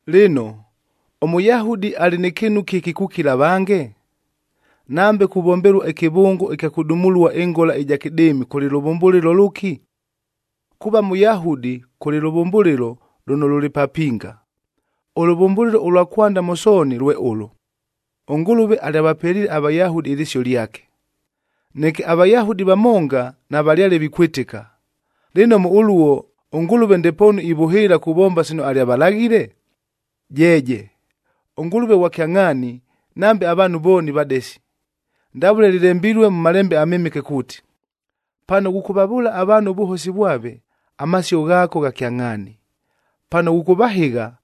Lɨno, ʉMʉyahudi alɨ nɨ kɨɨnu kɨki kukila avange? Nambe kuvombelua ɨkɨvʉngo ɨkya kʉdumulua ɨngola ɨja kɨdɨɨmi kʉlɨ lʉvʉmbʉlɨlo lʉki? Kuuva Mʉyahudi kʉlɨ lʉvʉmbʉlɨlo lʉno lʉlɨ papinga. Ʉlʉvʉmbʉlɨlo ʉlwa kwanda mʉ sooni lwe ʉlʉ, ʉNgʉlʉve alyavapeliile aVayahudi ɨlɨsio lyake. Neke aVayahudi vamonga navalyale vikwɨtɨka. Lɨno mʉ ʉluo, ʉNgʉlʉve ndepoonu ivʉhɨɨla kuvomba sino alyavalaghile? Jeeje, ʉNgʉlʉve ghwa kyangʼhaani, nambe avaanhu vooni vadesi. Ndavʉle lɨlembilue mʉ Malembe aMɨmɨke kuuti, “Pano ghʉkʉvavʉʉla avaanhu ʉvʉhosi vwave, amasio ghaako gha kyangʼhaani. Pano ghʉkʉvahɨgha,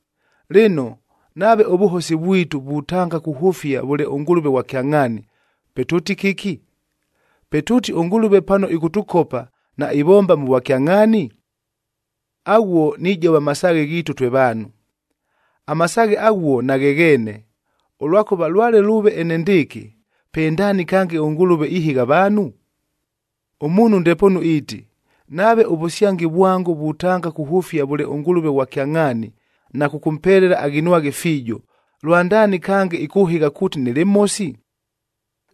Lɨno, nave ʉvʉhosi vwitu vutanga kuhʉfia vʉle ʉNgʉlʉve ghwa kyangʼhaani, pe tʉʉti kɨki? Pe tʉʉti ʉNgʉlʉve pano ɨkʉtʉkopa, naivomba mʉ vwakyangʼhaani? Aghuo nijova masaaghe ghiitu twe vaanhu. Amasaaghe aghuo naghegheene, ʉlwakʉva lwale lʉʉve enendɨɨkɨ, pe ndaani kange ʉNgʉlʉve ihɨgha avaanhu? Ʉmuunhu ndepoonu iiti, “Nave ʉvʉsyangi vwango vutanga kuhʉfia vʉle ʉNgʉlʉve ghwa kyangʼhaani na kʉkʉmpelela aghinwaghe fiijo, lwandaani kange ɨkʉhɨgha kuuti nɨlɨ mhosi?”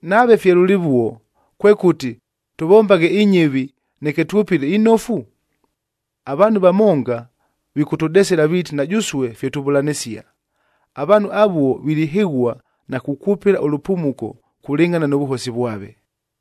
Nave fye lʉlɨvuo, kwekʉti, “Tʉvombaghe inyɨvi neke twʉpɨle inofu”? Avaanhu vamonga vikʉtʉdesela viiti na jʉsue fye tuvʉlanɨsia. Avaanhu avuo vilihɨghua na kukwʉpɨla ʉlʉpumuko kulɨngʼhana nʉ vʉhosi vwave.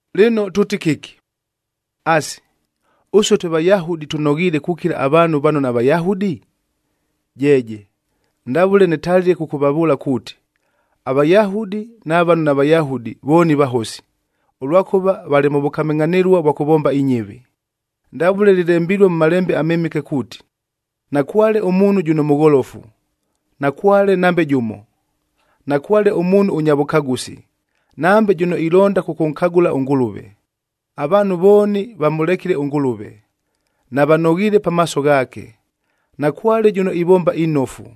Lɨno tʉʉti kɨki? Asi, ʉsue twe Vayahudi tʉnoghiile kukila avaanhu vano naVayahudi? Jeeje! Ndavʉle nɨtalile kʉkʉvavʉʉla kuuti, aVayahudi na vano naVayahudi vooni vahosi, ʉlwakʉva valɨ mʉ vʉkamɨngʼhanɨlua vwa kʉvomba inyɨvi. Ndavʉle lɨlembilue mʉ Malembe aMɨmɨke kuuti, “Nakwale ʉmuunhu jʉno mʉgholofu, nakwale nambe jʉmo. Nakwale ʉmuunhu ʉnya vʉkagʉsi, nambe jʉno ilonda kʉkʉnkagʉla ʉNgʉlʉve. Avaanhu vooni vamʉlekile ʉNgʉlʉve, navanoghiile pamaaso ghaake. Nakwale jʉno ivomba inofu,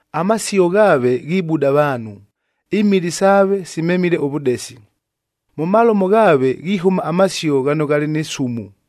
“Amasio ghaave ghibuda avaanhu,c imili saave simemile ʉvʉdesi.”d “Mʉ malomo ghaave ghihʉma amasio ghano ghalɨ nɨ sumu,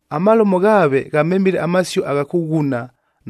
“Amalomo ghaave ghamemile amasio agha kʉghuna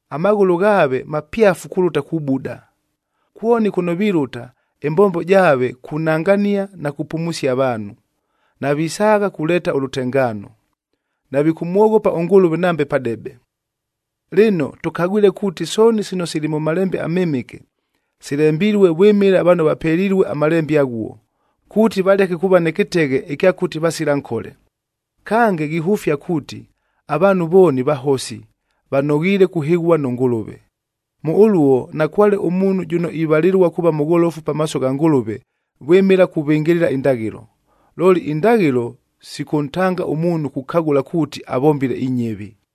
“Amaghʉlʉ ghaave mapyafu kulʉta kubuda. Kwoni kʉno vilʉta, ɨmbombo jaave kunangania na kupumusia avaanhu. Navisaagha kuleeta ʉlʉtengaano.”g “Navikʉmwoghopa ʉNgʉlʉve nambe padebe!”h Lɨno, tʉkagwile kuuti sooni sino sili mʉ Malembe aMɨmɨke, silembilue vwɨmɨla vano vapelilue aMalembe aghuo, kuuti valeke kuuva nɨ kɨteghe ɨkya kʉti vasila nkole. Kange, ghihʉfia kuuti avaanhu vooni vahosi, vanoghiile kuhɨghua nʉ Ngʉlʉve. Mʉ ʉluo nakwale ʉmuunhu jʉno ivalɨlua kuuva mʉgholofu pamaaso gha Ngʉlʉve vwɨmɨla kuvɨngɨlɨla indaghɨlo. Looli indaghɨlo sikʉntanga ʉmuunhu kukagʉla kuuti avombile inyɨvi.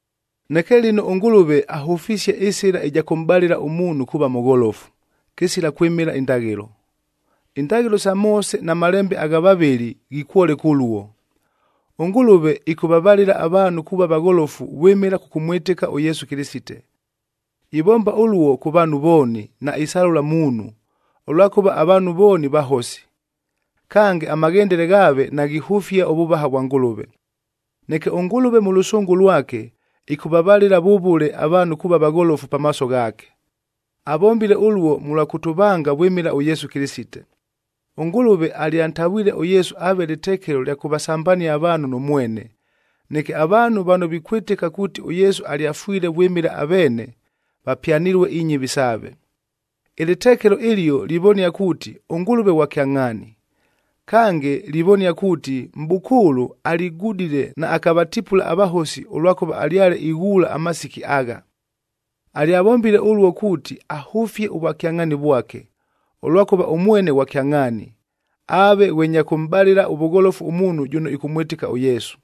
Neke lɨno ʉNgʉlʉve ahʉfisie ɨsɨla ɨja kʉmʼbalɨla ʉmuunhu kuuva mʉgholofu, kɨsila kwɨmɨla indaghɨlo. Indaghɨlo sa Moose na malembe agha vavɨli ghikwoleka ʉluo. ɄNgʉlʉve ɨkʉvavalɨla avaanhu kuuva vagholofu vwɨmɨla kʉkʉmwɨtɨka ʉYesu Kɨlɨsite. Ivomba ʉluo kʉ vaanhu vooni, naisalʉla muunhu, ʉlwakʉva avaanhu vooni vahosi, kange amaghendele ghaave naghihʉfia ʉvʉvaha vwa Ngʉlʉve. Neke ʉNgʉlʉve mʉ lʉsʉngʉ lwake, ɨkʉvavalɨla vʉvʉle avaanhu kuuva vagholofu pamaaso ghaake. Avombile ʉluo mʉlwa kʉtʉvanga vwɨmɨla ʉYesu Kɨlɨsite. ɄNgʉlʉve alyantavwile ʉYesu aave lɨtekelo lya kʉvasambania avaanhu nʉ mwene, neke avaanhu vano vikwɨtɨka kuuti ʉYesu alyafwile vwɨmɨla aveene, vapyanɨlue inyɨvi saave. Ɨlɨtekelo ɨlio livonia kuuti ʉNgʉlʉve ghwa kyangʼhaani. Kange livonia kuuti, mʼbʉkʉʉlʉ aligudile naakavatipula avahosi ʉlwakʉva alyale ighuula amasiki agha. Alyavombile ʉluo kuuti ahʉfie ʉvwakyangʼhaani vwake, ʉlwakʉva ʉmwene ghwa kyangʼhaani, aave ghwe nya kʉmʼbalɨla ʉvʉgholofu ʉmuunhu jʉno ɨkʉmwɨtɨka ʉYesu.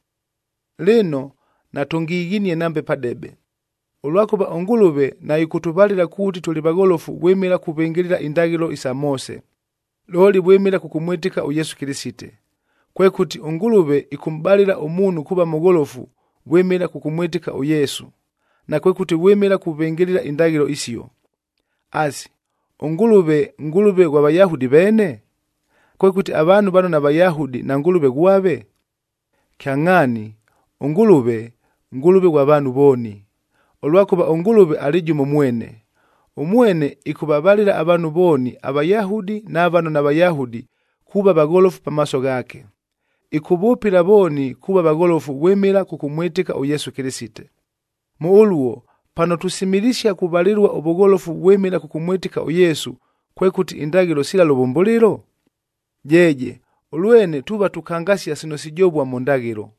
Lɨno, natʉngighinie nambe padebe, ʉlwakʉva ʉNgʉlʉve naɨkʉtʉvalɨla kuuti tʉlɨ vagholofu vwɨmɨla kuvɨngɨlɨla indaghɨlo sa Moose, looli vwɨmɨla kʉkʉmwɨtɨka ʉYesu Kɨlɨsite. Kwekʉti, ʉNgʉlʉve ɨkʉmʼbalɨla ʉmuunhu kuuva mʉgholofu vwɨmɨla kʉkʉmwɨtɨka ʉYesu, nakwekʉti vwɨmɨla kuvɨngɨlɨla indaghɨlo isio. Asi, ʉNgʉlʉve, Ngʉlʉve ghwa Vayahudi veene? Kwekʉti avaanhu vano naVayahudi naNgʉlʉve ghwave? Kyangʼhaani, ʉNgʉlʉve, Ngʉlʉve ghwa vaanhu vooni, ʉlwakʉva ʉNgʉlʉve alɨ jʉmo mwene. Ʉmwene ɨkʉvavalɨla avaanhu vooni aVayahudi na vano naVayahudi kuuva vagholofu pamaaso ghaake, ɨkʉvʉpɨla vooni kuuva vagholofu vwɨmɨla kʉkʉmwɨtɨka ʉYesu Kɨlɨsite. Mʉ ʉluo, pano tusimilisia kuvalɨlua ʉvʉgholofu vwɨmɨla kʉkʉmwɨtɨka ʉYesu, kwekʉti indaghɨlo sila lʉvʉmbʉlɨlo? Jeeje, ʉlwene tuuva tukangasia sino sijovua mʉ ndaghɨlo.